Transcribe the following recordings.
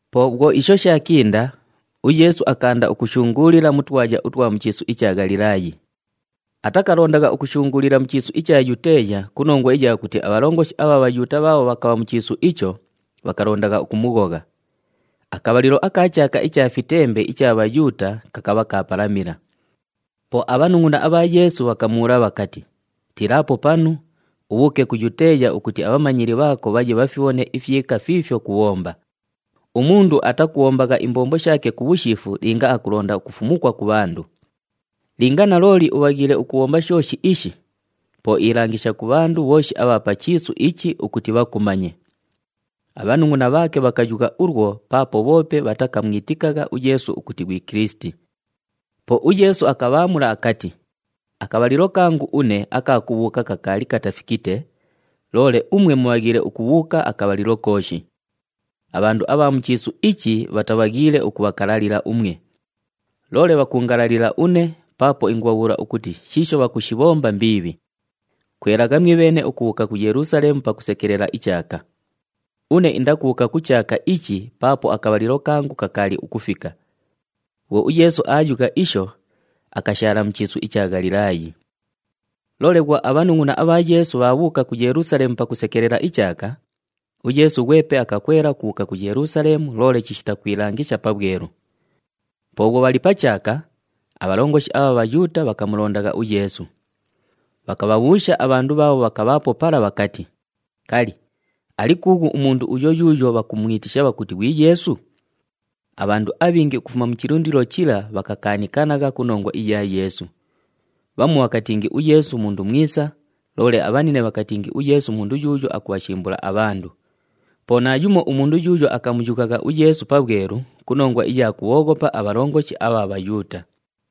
Po bhwo isho shaakinda, uYeesu akaanda ukushunguulila mu twaya utwa mu chiisu icha Ghalilaayi. Atakalondagha ukushunguulila mu chiisu icha Yuteeya ku nongwa iya kuti abhalongoshi abha Bhayuuta bhaabho bhakabha mu chiisu icho, bhakalondagha ukumughogha. Akabhalilo aka chaaka icha Fitembe icha Bhayuuta kakabha kaapalamila. Po abhanungʼuna abha Yeesu bhakamubhuula bhakati, “Tiilaapo panu, ubhuuke ku Yuteeya ukuti abhamanyili bhaako bhaye bhafibhone ifyika fiifyo kubhomba. Umundu atakubhombagha imbombo shaake ku bhushiifu linga akulonda ukufumukwa ku bhandu. Linga nalooli ubhaghiile ukubhomba shooshi ishi, po ilangisha ku bhandu bhooshi abha pa chiisu ichi ukuti bhakumanye.” Abhanungʼuna bhaake bhakayugha ulwo paapo bhoope bhatakamwitikagha uYeesu ukuti ghwi Kilisiti. Po uYeesu akabhaamula akati, “Akabhalilo kangu une aka kubhuuka kakaali katafikite, loole umwe mubhaghiile ukubhuuka akabhalilo kooshi. Abhandu abha mu chiisu ichi bhatabhaghiile ukubhakalalila umwe, loole bhakuungalalila une paapo ingubhabhuula ukuti shiisho bhakushibhomba mbiibhi. Kwelagha mwibheene ukubhuuka ku Yelusaleemu pakusekelela ichaaka. Une indakubhuuka ku chaaka ichi paapo akabhalilo kangu kakaali ukufika.” Bhwo uYeesu aayugha isho, akashaala mu chiisu icha Ghalilaayi. Loole bhwo abhanungʼuna abha Yeesu bhaabhuuka ku Yelusaleemu pakusekelela ichaaka, uYeesu ghwepe akakwela ukubhuuka ku Yelusaleemu loole chishita kwilangisha pabhwelu. Po bhwo bhali pa chaaka, abhalongoshi abha Bhayuuta bhakamulondagha uYeesu. Bhakabhabhuusha abhandu bhaabho bhakabhaapo pala bhakati, “Kali, ali kuughu umundu uyo yuuyo bhakumwitisha bhakuti ghwi Yeesu?” Abhandu abhingi ukufuma mu chilundilo chila bhakakaanikanagha ku nongwa iya Yeesu. Bhamu bhakatingi uYeesu mundu mwisa, loole abhanine bhakatingi uYeesu mundu yuuyo akubhashimbula abhandu. Po naayumo umundu yuuyo akamuyughagha uYeesu pabhwelu ku nongwa iya kubhooghopa abhalongoshi abha Bhayuuta.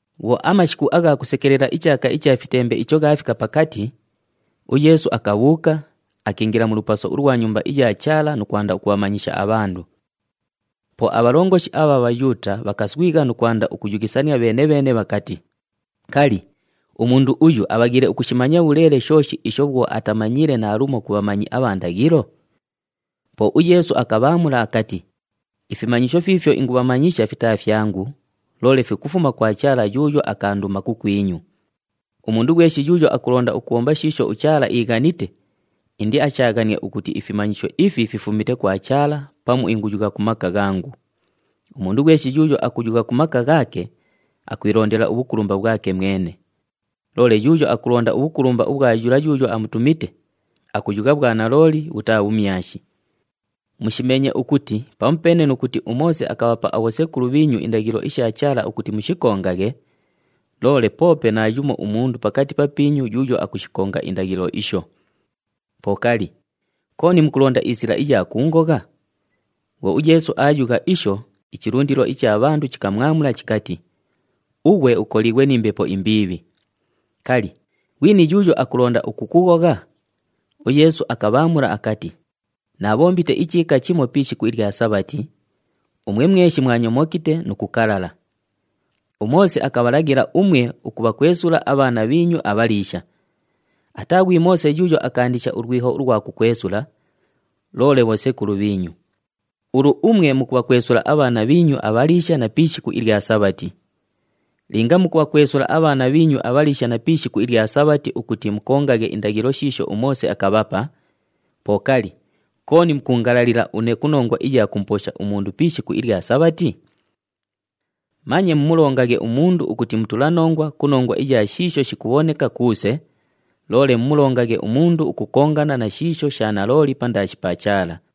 Bhwo amashiku agha kusekelela ichaaka icha Fitembe icho ghaafika pakati, uYeesu akabhuuka, akiingila mu lupaso ulwa Nyumba iya Chaala nu kwanda ukubhamanyisha abhandu. Po abhalongoshi abha Bhayuuta bhakaswigha nu kwanda ukuyughisania bheene-bheene bhakati, “Kali, umundu uyu abhaghiile ukushimanya bhuleele shooshi isho bhwo atamanyiile naalumo ku bhamanyi abha ndaghilo?” Po uYeesu akabhaamula akati, “Ifimanyisho fiifyo ingumanyisha fitaa fyangu, loole fikufuma kwa Chaala yuuyo akaanduma kukwinyu. Umundu ghweshi yuuyo akulonda ukubhomba shiisho uChaala iighanite, indiashaaghanie ukuti ifimanyisho ifi fifumite kwa Chaala pamu inguyugha ku maka ghangu. Umundu ghweshi yuuyo akuyugha ku maka ghaake, akwilondela ubhukulumba bhwake mwene. Loole yuuyo akulonda ubhukulumba ubhwa yula yuuyo amutumite, akuyugha bhwanalooli, bhutaa bhumyashi. Mushimeenye ukuti pamupeene nu kuti uMoose akabhapa abhosekulu bhiinyu indaghilo isha Chaala ukuti mushikongaghe, loole poope naayumo umundu pakati papiinyu yuuyo akushikonga indaghilo isho. Po kali, kooni mukulonda isila iya kuungogha?” Bhwo uYeesu aayugha isho, ichilundilo icha bhandu chikamwamula chikati, “Ughwe ukoliighwe ni mbepo imbiibhi! Kali, ghwini yuuyo akulonda ukukughogha?” UYeesu akabhaamula akati, “Naabhombite ichiika chimo pi ishiku ilya Sabhati, umwe mweshi mwanyomokite nu kukalala. UMoose akabhalaghila umwe ukubhakwesula abhaana bhiinyu abhaliisha. Ataa ghwi Moose yuuyo akaandisha ulwiho ulwa kukwesula, loole bhosekulu bhiinyu. Ulu umwe mukubhakwesula abhaana bhiinyu abhaliisha na pi ishiku ilya Sabhati. Linga mukubhakwesula abhaana bhiinyu abhaliisha na pi ishiku ilya Sabhati ukuti mukongaghe indaghilo shiisho uMoose akabhapa, po kali, kooni mukuungalalila une ku nongwa iya kumuposha umundu pi ishiku ilya Sabhati? Manye mumulongaghe umundu ukuti mutulanongwa ku nongwa iya shiisho shikubhoneka kuuse, loole mumulongaghe umundu ukukongana na shiisho sha nalooli pandaashi pa Chaala.”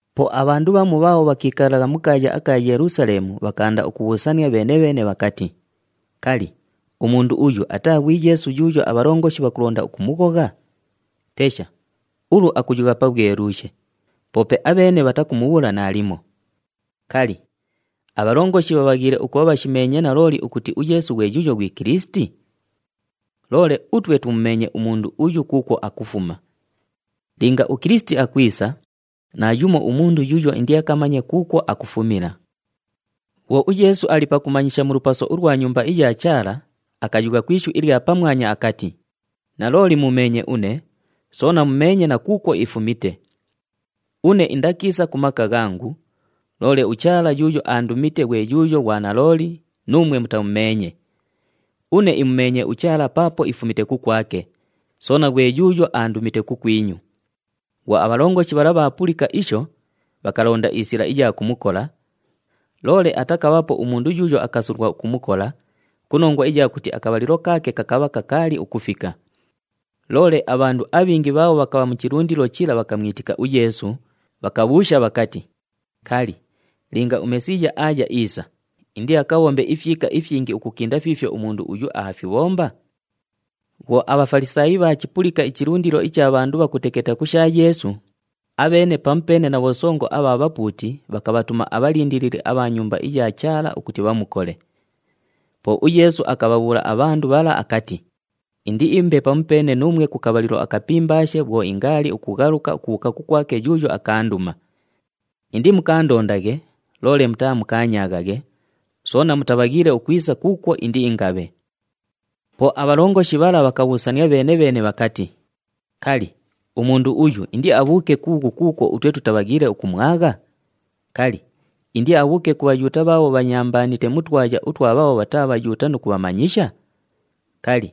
Po abhandu bhamu bhaabho bhakiikalagha mu kaaya aka Yelusaleemu bhakaanda ukubhuusania bheene-bheene bhakati, “Kali, umundu uyu ataa ghwi Yeesu yuuyo abhalongoshi bhakulonda ukumughogha? Tesha, ulu akuyugha pabhweluushe, poope abheene bhatakumubhuula naalimo! Kali, abhalongoshi bhabhaghiile ukubha bhashimeenye nalooli ukuti uYeesu ghwe yuuyo ghwi Kilisiti? Loole utwe tumumeenye umundu uyu kuukwo akufuma. Linga uKilisiti akwisa, naayumo umundu yuuyo indiakamanye kuukwo akufumila.” Bhwo uYeesu ali pakumanyisha mu lupaso ulwa Nyumba iya Chaala, akayugha ku ishu ilya pamwanya akati, “Nalooli muumeenye une, soona mumeenye na kuukwo ifumite. Une indakiisa ku maka ghangu, loole uChaala yuuyo aandumite ghwe yuuyo ghwa nalooli, nuumwe mutamumeenye. Une imumeenye uChaala paapo ifumite kukwake, soona ghwe yuuyo aandumite kukwinyu.” Bhwo abhalongoshi bhala bhaapulika isho, bhakalonda isila iya kumukola, loole atakabhaapo umundu yuuyo akasulwa ukumukola ku nongwa iya kuti akabhalilo kaake kakabha kakaali ukufika. Loole abhandu abhingi bhaabho bhakabha mu chilundilo chila bhakamwitika uYeesu, bhakabhuusha bhakati, “Kali, linga uMesiiya aaya iisa, indiakabhombe ifyika ifyingi ukukinda fiifyo umundu uyu aafibhomba?” Bhwo aBhafalisaayi bhaachipulika ichilundilo icha bhandu bhakuteketa ku sha Yeesu, abheene pamupeene na bhosongo abha bhapuuti bhakabhatuma abhalindilili abha Nyumba iya Chaala ukuti bhamukole. Po uYeesu akabhabhuula abhandu bhala akati, “Indiimbe pamupeene nuumwe ku kabhalilo akapimbaashe bhwo ingaali ukughaluka ukubhuuka kukwake yuuyo akaanduma. Indimukaandondaghe, loole mutaamukaanyaaghaghe, soona mutabhaghiile ukwisa kuukwo indiingabhe.” Po abhalongoshi bhala bhakabhuusania bheene-bheene bhakati, “Kali, umundu uyu indiabhuuke kuughu kuukwo utwe tutabhaghiile ukumwagha? Kali, indiabhuuke ku Bhayuuta bhaabho bhanyambaanite mu twaya utwa bhaabho bhataa Bhayuuta nu kubhamanyisha? Kali,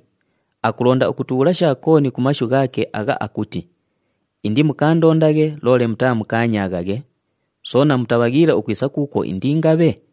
akulonda ukutubhuula sha kooni ku mashu ghaake agha akuti, ‘Indimukaandondaghe, loole mutaamukaanyaaghaghe, soona mutabhaghiile ukwisa kuukwo indiingabhe’?”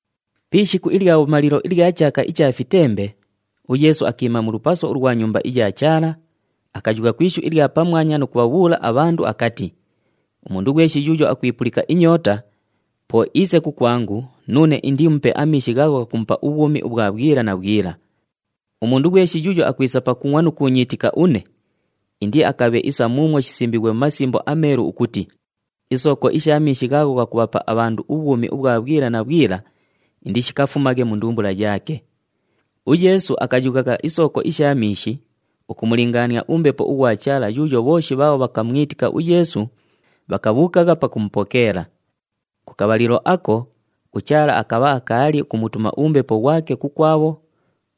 Pi ishiku ilya bhumalilo ilya chaaka icha Fitembe, uYeesu akiima mu lupaso ulwa Nyumba iya Chaala, akayugha ku ishu ilya pamwanya nu kubhabhuula abhandu akati, “Umundu ghweshi yuuyo akwipulika inyoota, po iise kukwangu nuune indiimupe amiishi ghaagho ghakumupa ubhwumi ubhwa bhwila na bhwila. Umundu ghweshi yuuyo akwisa pakungʼwa nu kuunyiitika une, indiakabhe isa muumwo shisimbiighwe mu Masimbo aMeelu ukuti, ‘Isooko isha miishi ghaagho ghakubhapa abhandu ubhwumi ubhwa bhwila na bhwila indishikafumaghe mu ndumbula yaake.’” UYeesu akayughagha isooko isha miishi ukumulingaania uMbepo ughwa Chaala yuuyo bhooshi bhaabho bhakamwitika uYeesu, bhakabhuukagha pakumupokeela. Ku kabhalilo ako, uChaala akabha akaali ukumutuma uMbepo ghwake kukwabho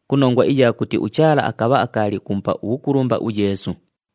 ku nongwa iya kuti uChaala akabha akaali ukumupa ubhukulumba uYeesu.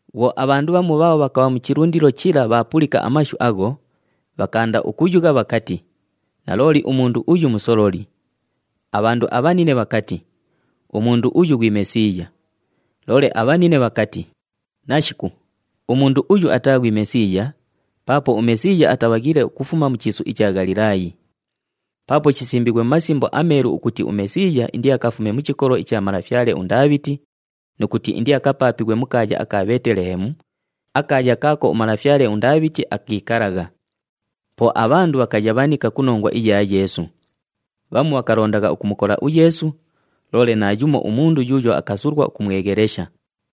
Bhwo abhandu bhamu bhaabho bhakabha mu chilundilo chila bhaapulika amashu agho, bhakaanda ukuyugha bhakati, “Nalooli umundu uyu musololi.” Abhandu abhanine bhakati, “Umundu uyu ghwi Mesiiya.” Loole abhanine bhakati, “Nashiku, umundu uyu ataa ghwi Mesiiya, paapo uMesiiya atabhaghiile ukufuma mu chiisu icha Ghalilaayi. Paapo shisimbiighwe mu Masimbo aMeelu ukuti uMesiiya indiakafume mu chikolo icha malafyale uNdaabhiti nu kuti indiakapaapighwe mu kaaya aka Bheetelehemu, akaaya kaako umalafyale uNdaabhiti akiikalagha.” Po abhandu bhakayabhanika ku nongwa iya Yeesu. Bhamu bhakalondagha ukumukola uYeesu, loole naayumo umundu yuuyo akasulwa ukumweghelesha.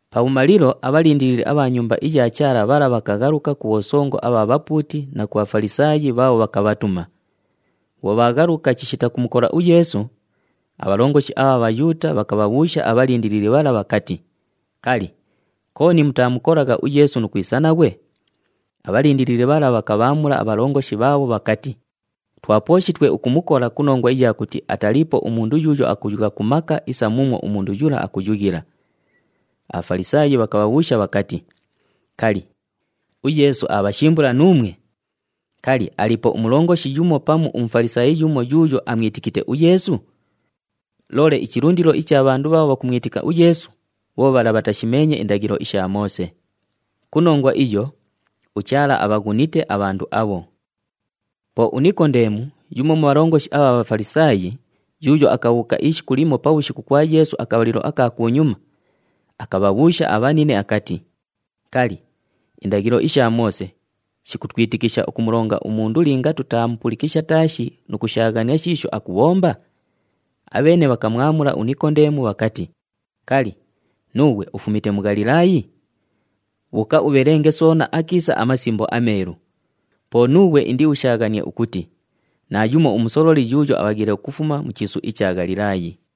Pabhumalilo abhalindilili abha Nyumba iya Chaala bhala bhakaghaluka ku bhosongo abha bhapuuti na ku bha Bhafalisaayi bhaabho bhakabhatuma. Bhwo bhaaghaluka chishita kumukola uYeesu, abhalongoshi abha Bhayuuta bhakabhabhuusha abhalindilili bhala bhakati, “Kali, kooni mutaamukolagha uYeesu nu kwisa naghwe?” Abhalindilili bhala bhakabhaamula abhalongoshi bhaabho bhakati, “Twapooshitwe ukumukola ku nongwa iya kuti ataliipo umundu yuuyo akuyugha ku maka isa muumwo umundu yula akuyughila.” ABhafalisaayi bhakabhabhuusha bhakati, “Kali, uYeesu aabhashimbula nuumwe? Kali, aliipo umulongoshi yumo pamu uMufalisaayi yumo yuuyo amwitikite uYeesu? Loole ichilundilo icha bhandu bhaabho bhakumwitika uYeesu bho bhala bhatashimeenye indaghilo isha Moose. Ku nongwa iyo, uChaala abhaghunite abhandu abho.” Po uNikondeemu, yumo mu bhalongoshi abha Bhafalisaayi, yuuyo akabhuuka ishiku limo pabhushiku kwa Yeesu akabhalilo aka kunyuma, akabhabhuusha abhanine akati, “Kali, indaghilo isha Moose shikutwitikisha ukumulonga umundu linga tutaamupulikisha taashi nu kushaaghania shiisho akubhomba?” Abheene bhakamwamula uNikondeemu bhakati, “Kali, nuughwe ufumite mu Ghalilaayi? Bhuuka ubhelenge soona akiisa aMasimbo aMeelu, po nuughwe indiushaaghanie ukuti naayumo umusololi yuuyo abhaghiile ukufuma mu chiisu icha Ghalilaayi.”